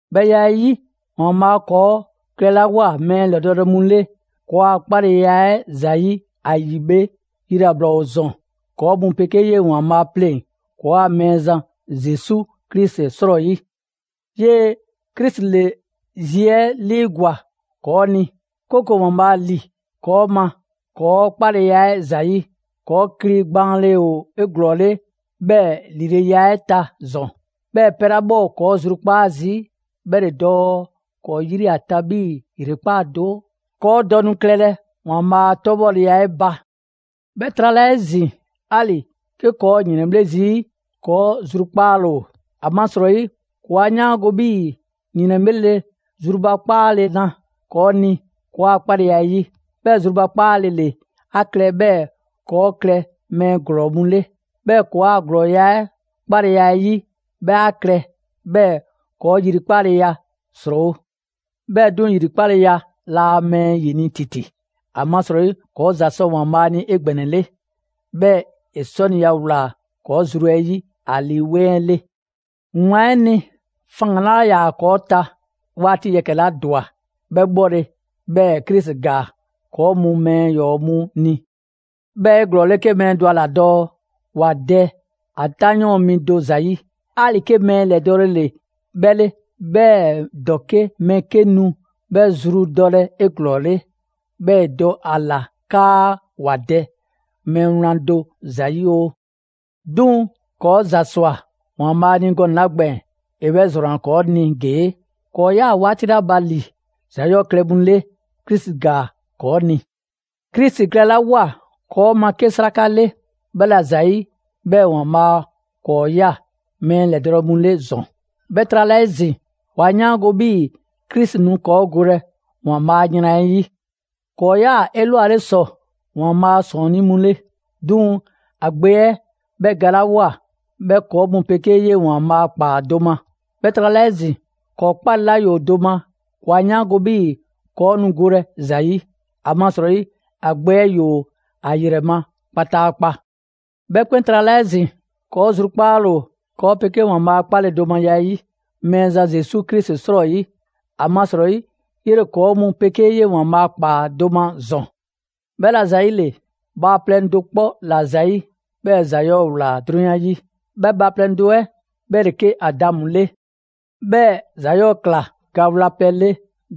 'Bhɛ ya 'ɛ 'yi, ‑Waanbhaa' ‑kɔɔ' klɛlawoa mɛɛ ‑lɛdɔɔle mu 'le ‑kɔɔa' 'kpaleya 'ɛ ‑zayi' ‑a ‑yi bhe, yilabla ‑o ‑zɔn ‑kɔɔ' mu 'pegee 'yee‑ ‑Waanbhaa' 'pleŋ‑ ‑kɔɔa' Mɛɛzan Zesu Krisi 'srɔyi. 'Yee‑ Krisi ‑le zi 'ɛ 'liigwa‑ ‑kɔɔ' ni, 'kooko‑ ‑Waanbhaa' ‑li ‑kɔɔ' ma ‑kɔɔ' 'kpaleya 'ɛ ‑zayi'. ‑Kɔɔ' kli gbaanle ‑o 'eglɔɔle 'bhɛɛ‑ ‑lileya 'ɛ ta ‑zɔn. 'Bhɛɛ‑ pɛ 'la 'bhɛ ‑kɔɔ' zrukpaa' zii' 'bhɛ ‑le dɔɔ ‑kɔɔ' 'yri ‑a ta 'bhii‑ ‑yrekpaa' do, ‑kɔɔ' dɔ nu klɛlɛ ‑Waanbhaa' 'a 'tɔbhɔleya 'ɛ ba. 'Bhɛ trala 'ezin‑, 'ali‑ 'ke ‑kɔɔ' ‑o ‑yrɛnbhle' zii', ‑kɔɔ' zrukpaale ‑o, ‑amasrɔyi ‑kɔɔ' 'a 'yaango‑ 'bhii‑ ‑yrɛnbhle' ‑le zrubakpaale na ‑kɔɔ' ni ‑kɔɔa' 'kpaleya 'ɛ 'yi. 'Bhɛɛ‑ zrubakpaale ‑le 'a klɛ 'bhɛɛ‑ ‑kɔɔ' klɛ mɛɛ ‑glɔɔ mu 'le. 'Bhɛɛ‑ ‑kɔɔa' ‑glɔɔya' 'ɛ 'kpaleya 'ɛ 'yi 'bhɛ 'a klɛ 'bhɛɛ‑ ‑kɔɔ' ‑yrikpaleya ‑srɔɔwo'. 'Bhɛɛ‑ 'duŋ‑, ‑yrikpaleya laa mɛɛ ‑yini' ‑titi, ‑amasrɔyi, ‑kɔɔ' ‑za sɔ ‑Waanbhaa' ni 'egbɛnɛle; 'bhɛɛ‑ ‑e 'sɔniya ꞊wlaa ‑kɔɔ' zru 'ɛ 'yi ‑a Lii 'Weŋ 'ɛ 'le. Wlan 'ɛ ni, faŋgan‑ 'laa ‑yaa ‑kɔɔ' ta 'waati 'la ba, ‑Waanbhaa' 'waati yɛkɛ‑ 'la ‑dwa, 'bhɛ 'bhɔle‑, 'bhɛɛ‑ Krisi ‑gaa ‑kɔɔ' mu mɛɛ ‑yɔɔ' mu ni. 'Bhɛ ‑o 'eglɔɔle 'ke mɛɛ dɔ a ‑la dɔɔ ‑wa dɛ ‑a 'tanyɔɔn mi do ‑zayi', 'ali‑ 'ke mɛɛ ‑lɛdɔɔle ‑le 'bhɛ 'le. 'Bhɛɛ‑ ‑dɔke' mɛɛ 'ke nu 'bhɛ zru dɔlɛ 'eglɔɔle, 'bhɛɛ‑ ‑e dɔ a ‑la 'kaa ‑wa dɛ mɛɛ wlan do ‑zayi' oo. 'Duŋ‑ ‑kɔɔ' ‑za ꞊swa ‑Waanbhaa' ni gɔnɛ‑ 'la gbɛɛn‑, ‑e 'bhɛ ‑zrɔnna ‑kɔɔ' ni ‑gee': ‑Kɔɔ' 'yaa‑ 'waati 'la ba ‑li ‑za 'yɔɔ‑ klɛ mu 'le, Krisi ‑gaa ‑kɔɔ' ni. Krisi klɛlawoa ‑kɔɔ' ma 'ke 'sraka 'le, 'bhɛla ‑zayi' 'bhɛɛ‑ ‑Waanbhaa' ‑kɔɔ' ꞊ya mɛɛ ‑lɛdɔɔle mu 'le ‑zɔn. 'Bhɛ trala 'ezin‑, ‑kɔɔ' 'a 'yaango‑ 'bhii‑ Krisi nu ‑kɔɔ' golɛ ‑Waanbhaa' a yran 'ɛ 'yi. ‑Kɔɔ' 'yaa‑ 'elwale ‑sɔ ‑Waanbhaa' ‑sɔɔnnii' mu 'le; 'duŋ‑ ‑a Gbe 'ɛ 'bhɛ galawoa, 'bhɛ ‑kɔɔ' mu 'pegee 'yee‑ ‑Waanbhaa' ꞊kpaa do ma. 'Bhɛɛ‑ trala 'ezin‑, ‑kɔɔ' 'kpale‑ 'la ‑yoo do ma, ‑kɔɔ' 'a 'yaango‑ 'bhii‑ ‑kɔɔ' nu golɛ ‑za 'yi, ‑amasrɔyi ‑a Gbe 'ɛ ‑yoo ‑a ‑yrɛ ma kpataakpa. 'Bhɛ 'kpɛn trala 'ezin‑, ‑kɔɔ' zrukpaale ‑o ‑kɔɔ' 'pegee ‑Waanbhaa' a 'kpaledomaya 'ɛ 'yi Mɛɛzan Zesu Krisi 'srɔyi, ‑amasrɔyi 'yele‑ ‑kɔɔ' mu 'pegee ‑Waanbhaa' ꞊kpaa do ma ‑zɔn. 'Bhɛla‑ ‑zayile, bhaaplɛŋ do 'kpɔ ‑la ‑zayi', 'bhɛɛ‑ ‑za 'yɔɔ‑ ‑wlaa 'drunyan 'yi, 'bhɛ bhaaplɛŋ 'ɛ 'bhɛ ‑le 'ke Adamu 'le. 'Bhɛɛ‑ ‑za 'yɔɔ‑ ꞊kla ga wlapɛ 'le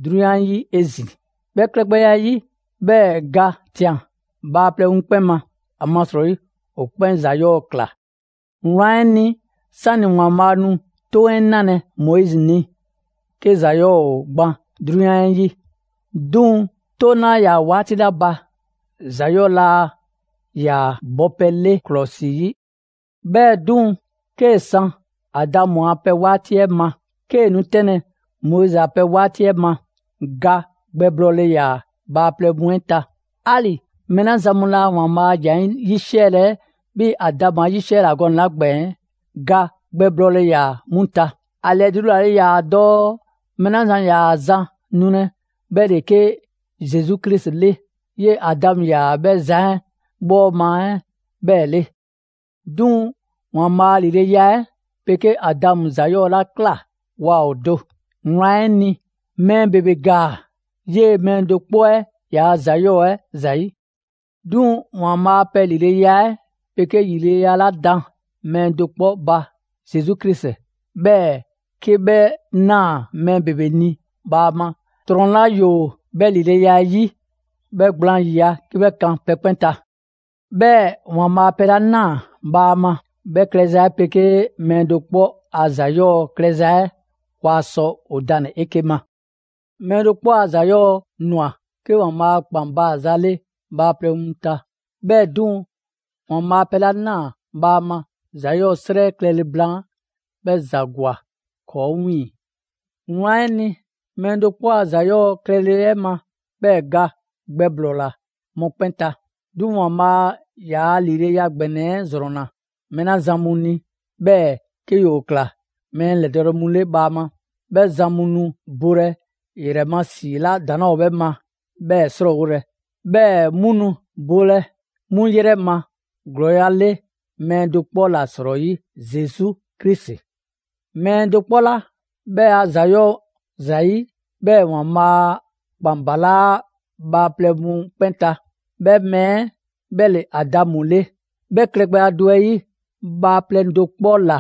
'drunyan 'yi 'ezin‑. 'Bhɛ klɛgbɛya 'ɛ 'yi, 'bhɛɛ‑ ga ꞊tian bhaaplɛŋ mu 'kpɛn ma, ‑amasrɔyi ‑o 'kpɛn ‑za 'yɔɔ‑ ꞊kla. Wlan 'ɛ ni, 'sani‑ ‑Waanbhaa' nu 'Toŋ 'ɛ 'nalɛ‑ Moizi ni, 'ke ‑za 'yɔɔ‑ ‑o gban 'drunyan 'ɛ 'yi. 'Duŋ‑ 'Toŋ 'laa ‑yaa 'waati 'la ba, ‑za 'yɔɔ‑ laa ‑yaa bɔpɛ 'le ‑klɔsi 'yi. 'Bhɛɛ‑ 'duŋ‑, 'kee‑ san Adamu a pɛ 'waati 'ɛ ma, 'kee‑ nu 'tɛnlɛ‑ Moizi a pɛ 'waati 'ɛ ma, ga gbɛblɔɔle ‑yaa bhaaplɛŋ mu 'ɛ ta. 'Ali‑ mɛɛ 'la zan mu laa ‑Waanbhaa' a ‑jan 'ɛ 'yisiɛlɛ 'bhii‑ Adamu 'a 'yisiɛla gɔnɛ‑ 'la gbɛɛn‑, ga gbɛblɔɔle ‑yaa 'mu ta. ‑A ‑lɛdulale 'la 'yaa‑ dɔɔ mɛɛ 'la zan ‑yaa zan nulɛ, 'bhɛ ‑le 'ke Zesu Krisi 'le, 'yee‑ Adamu ‑yaa 'bhɛ zan 'ɛ bhɔɔma 'ɛ 'bhɛɛ‑ 'le. 'Duŋ‑ ‑Waanbhaa' a ‑lileya 'ɛ 'pegee Adamu ‑za 'yɔɔ‑ 'la ꞊kla waa ‑o do. Wlan 'ɛ ni, mɛɛ ‑bebe ‑gaa 'yee‑ mɛɛ do 'kpɔ 'ɛ yaa ‑za 'yɔɔ‑ 'ɛ ‑zayi'. 'Duŋ‑ ‑Waanbhaa' a pɛ ‑lileya 'ɛ pegee ‑lileya 'la da mɛɛ do 'kpɔ ba, Zesu Krisi, 'bhɛɛ‑ 'kee‑ 'bhɛ ꞊naa mɛɛ ‑bebe ni bhaama, ‑nafan 'la ‑yoo 'bhɛ ‑lileya 'ɛ 'yi, 'bhɛ gblaan ‑yiya' 'ke 'bhɛ kan pɛ 'kpɛn ta. 'Bhɛɛ‑ ‑Waanbhaa' pɛ 'la ꞊naa bhaama 'bhɛ klɛza 'ɛ 'pegee mɛɛ do 'kpɔ a ‑za 'yɔɔ‑ klɛza 'ɛ, waa sɔ ‑o danle‑ 'eke‑ ma. Mɛɛ do 'kpɔ 'a ‑za 'yɔɔ‑ ꞊nwa 'ke ‑Waanbhaa' a ‑kpan baaza 'le bhaaplɛŋ mu ta. 'Bhɛɛ‑ 'duŋ‑, ‑Waanbhaa' pɛ 'la ꞊naa bhaama ‑za 'yɔɔ‑ 'srɛ klɛle blaan, 'bhɛ ‑za ‑gwa 'kɔɔ‑ 'wiiŋ‑. Wlan 'ɛ ni, mɛɛ do 'kpɔ a ‑za 'yɔɔ‑ klɛle 'ɛ ma, 'bhɛɛ‑ ga gbɛblɔɔla mɔkpɛn' ta. 'Duŋ‑ ‑Waanbhaa' yaa ‑lileya ‑gbɛnɛ 'ɛ ‑zrɔnna mɛɛ 'la zan mu ni, 'bhɛɛ‑ 'ke ‑yoo ꞊kla mɛɛ ‑lɛdɔɔle mu 'le bhaama; 'bhɛ zan mu nu bole ‑yrɛ ma ‑si 'la ‑daŋ' 'laa ‑o 'bhɛ ma 'bhɛɛ‑ 'srɔɔwolɛ, 'bhɛɛ‑ 'mu nu bolɛ 'mu 'yrɛ ma ‑glɔɔya' 'le mɛɛ do 'kpɔ ‑la 'srɔyi: Zesu Krisi. Mɛɛ do 'kpɔ 'la 'bhɛ a ‑za 'yɔɔ‑ ‑zayi' 'bhɛɛ‑ ‑Waanbhaa' a ‑kpan balaa' bhaaplɛŋ mu 'kpɛn ta, 'bhɛ mɛɛ 'ɛ 'bhɛ ‑le Adamu 'le. 'Bhɛ klɛgbɛya do 'ɛ 'yi, bhaaplɛŋ do 'kpɔ ‑la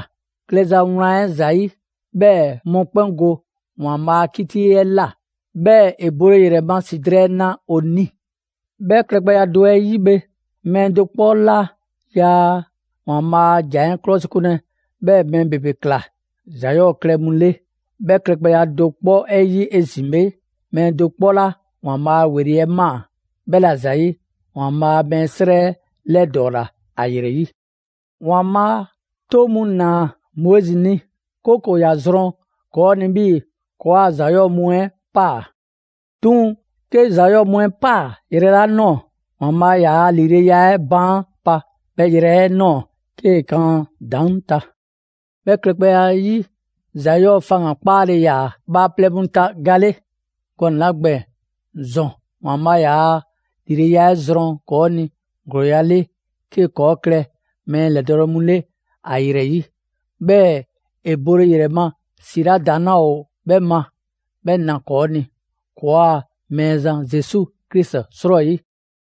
klɛza wlan 'ɛ ‑zayi', 'bhɛɛ‑ mɔkpɛn' go ‑Waanbhaa' a 'kiti 'ɛ ꞊la, 'bhɛɛ‑ ‑e bole ‑yrɛ ma ‑si drɛɛ na ‑o ni. 'Bhɛ klɛgbɛya 'ɛ 'yi bhe, mɛɛ do 'kpɔ 'la yaa ‑Waanbhaa' a ‑jan 'ɛ 'klɔsikunlɛ, 'bhɛɛ‑ mɛɛ ‑bebe ꞊kla ‑za 'yɔɔ‑ klɛ mu 'le; 'bhɛ klɛgbɛya do 'kpɔ 'ɛ 'yi 'ezin‑ bhe, mɛɛ do 'kpɔ 'la ‑Waanbhaa' ‑weli' 'ɛ ꞊maa, 'bhɛ ‑la ‑zayi', ‑Waanbhaa' mɛɛ 'srɛ 'lɛdɔɔla ‑a ‑yrɛ 'yi. ‑Waanbhaa' 'toŋ mu ꞊naa Moizi ni, 'kooko‑ ‑ya zrɔn ‑kɔɔ' ni 'bhii‑ ‑kɔɔa' ‑za 'yɔɔ‑ mu 'ɛ ꞊paa. 'Duŋ‑ 'ke ‑za 'yɔɔ‑ mu 'ɛ ꞊paa yrɛ 'la ꞊nɔɔ, ‑Waanbhaa' ‑yaa' ‑lileya 'ɛ baan pa 'bhɛ yrɛ 'ɛ ꞊nɔɔ 'kee kan ‑a ‑daŋ' ta 'Bhɛ klɛgbɛya 'ɛ 'yi, ‑za 'yɔɔ‑ faŋgan‑ 'kpaale‑ ‑yaa bhaaplɛŋ mu ta ga 'le gɔnɛ‑ 'la gbɛɛn‑; ‑zɔn ‑Waanbhaa' ‑yaa' ‑lileya 'ɛ zrɔn ‑kɔɔ' ni ‑glɔɔya' 'le 'kee‑ ‑kɔɔ' klɛ mɛɛ ‑lɛdɔɔle mu 'le ‑a ‑yrɛ 'yi, 'bhɛɛ‑ ‑e bole ‑yrɛ ma ‑si 'la ‑daŋ' 'laa ‑o 'bhɛ ma 'bhɛ na ‑kɔɔ' ni ‑kɔɔa' Mɛɛzan Zesu Krisi 'srɔyi.